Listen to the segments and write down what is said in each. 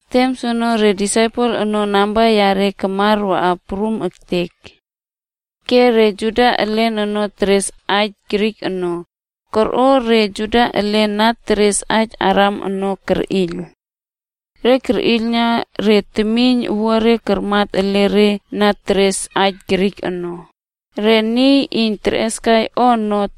Tem soono, re disaipel ono namba reꞌe ono takmar akwa prum ektek. Ke re Juda elen na teres aij Grik ono, korꞌo re Juda elen na teres aij Aram ono kerꞌiyl. Re kerꞌiylna re temiyn owuare karmat ele re na teres aij Grik ono, re niy iyn terꞌeskai o ono,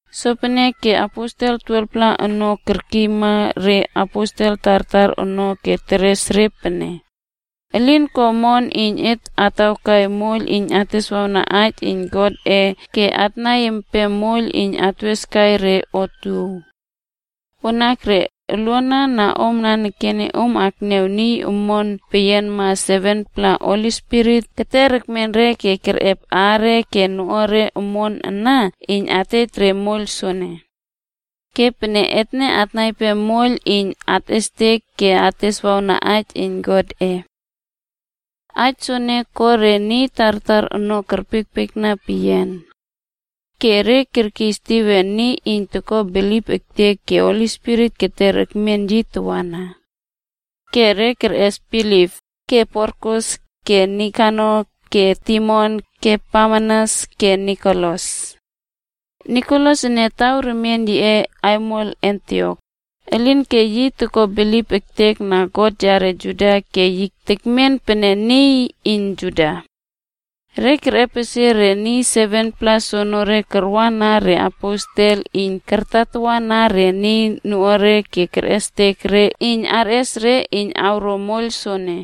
Sopeneke aposel 12-pla ono kerkiyma re disaipel tartar ono ke teres re pene, “Elin ko omon iyn et atawkai moiyl iyn ateswawna aij iyn Godꞌe ke atnaiy empem moiyl iyn atweskai re otuow. Wanakre, oluana na om ana, om akniaw niy omon peyianma 7-pla Holi Spirit keter ekmen re ke kerꞌep aare ke noꞌuare omon ana iyn atej re moiyl soene. Ke pene etne atnaiy empem moiyl iyn atꞌestek ke ateswawna aij iyn Godꞌe.” Aij soene ko re niy tartar ono kerpiekpiekna peyian. Ke re kerꞌes Stiven, niy iyn toko bilip ektek ke Holi Spirit keter ekmen yi tawana. Ke re kerꞌes Filip, ke Prokorus, ke Nikanor, ke Timon, ke Parmenas, ke Nikolas. Nikolas ene taw remien yiꞌe aimol Antiok, elinke yi toko bilip ektekna God yare Juda ke yi tekmen pene niy iyn Juda. Re kerꞌepesie re niy 7-pla soenere karwa na reaposel iyn kartatawana re noꞌuare ke kerꞌestek re iyn arꞌes re iyn awro moiyl soene.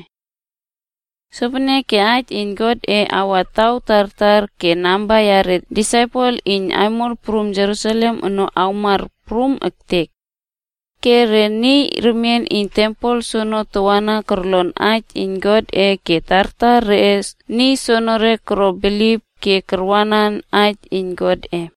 Sopeneke aij iyn Godꞌe kawa taw tartar ke namba yare disaipel iyn aimol prum Jerusalem ono kamar prum ektek. Ke re niy remien iyn tempel ono tawana korlon aij iyn Godꞌe ke tartar reꞌe niy soenere koro bilip ke karwanan aij iyn Godꞌe.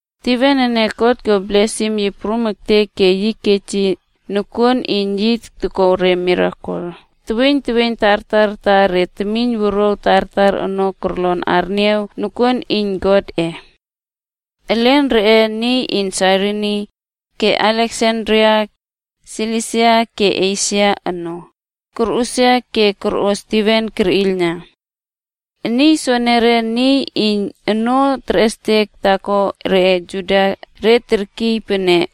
Stiven ene, God ko blesim yi prum ektek ke yi kej yi nokuon iyn yi toko re mirakel teweiyn teweiyn tartar ta re temiyn wuruaw tartar ono kolon arniaw nokuon iyn Godꞌe. Elen reꞌe niy iyn aimol Sairini, ke Aleksandria, provins Silisia ke Esia ono, korꞌusia ke korꞌo Stiven kerꞌiylna. Niy soenere, re niy iyn onoo terꞌestek taako reꞌe Juda re terkiy pene,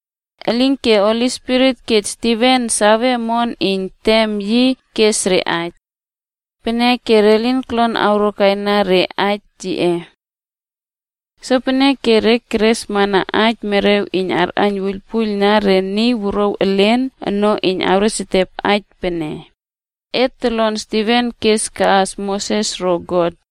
Elinke Holi Spirit kej Stiven save omon iyn tem yi kes re aij. Peneke, re lin korlon awrokaina re aij yiꞌe. Sopeneke re keresmana aij merew iyn karꞌaiyn wuiylpuiylna re niy wuruaw elen ono iyn awresetep aij pene, “Et tolon Stiven kes kaꞌas Moses ro God.”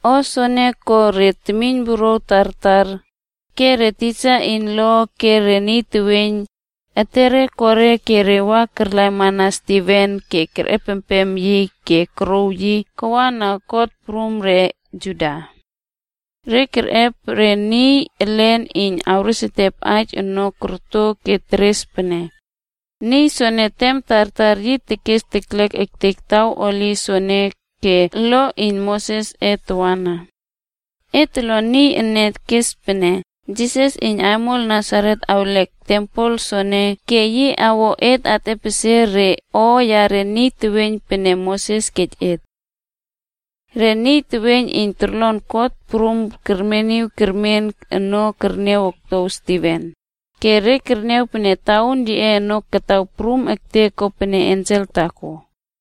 O soene ko re temiyn wuruaw tartar, ke re tisa iyn lo ke re niy teweiyn, etere ko re ke re wa karlaimana Stiven ke kerꞌepempem yi ke korouw yi kawa na kot prum reꞌe Juda. Re kerꞌep re niy elen iyn awreswawna aij kiskurna ono korto ke teres pene, “Niy soene tem tartar yi tekes teklek ektek taw holi soene ke lo iyn Mosesꞌe tawana. Et tolon niy ene kes pene Jisas iyn Aimol Nasaret awlek tempel soene ke yi awꞌo et atꞌepesie re o yare niy teweiyn pene Moses kej et.” Re niy teweiyn iyn torlon kot prum kermeniw kermen ono kerniaw oktow Stiven, ke re kerniaw pene tauun yiꞌe ono kataw prum ektek kopene ensel taako.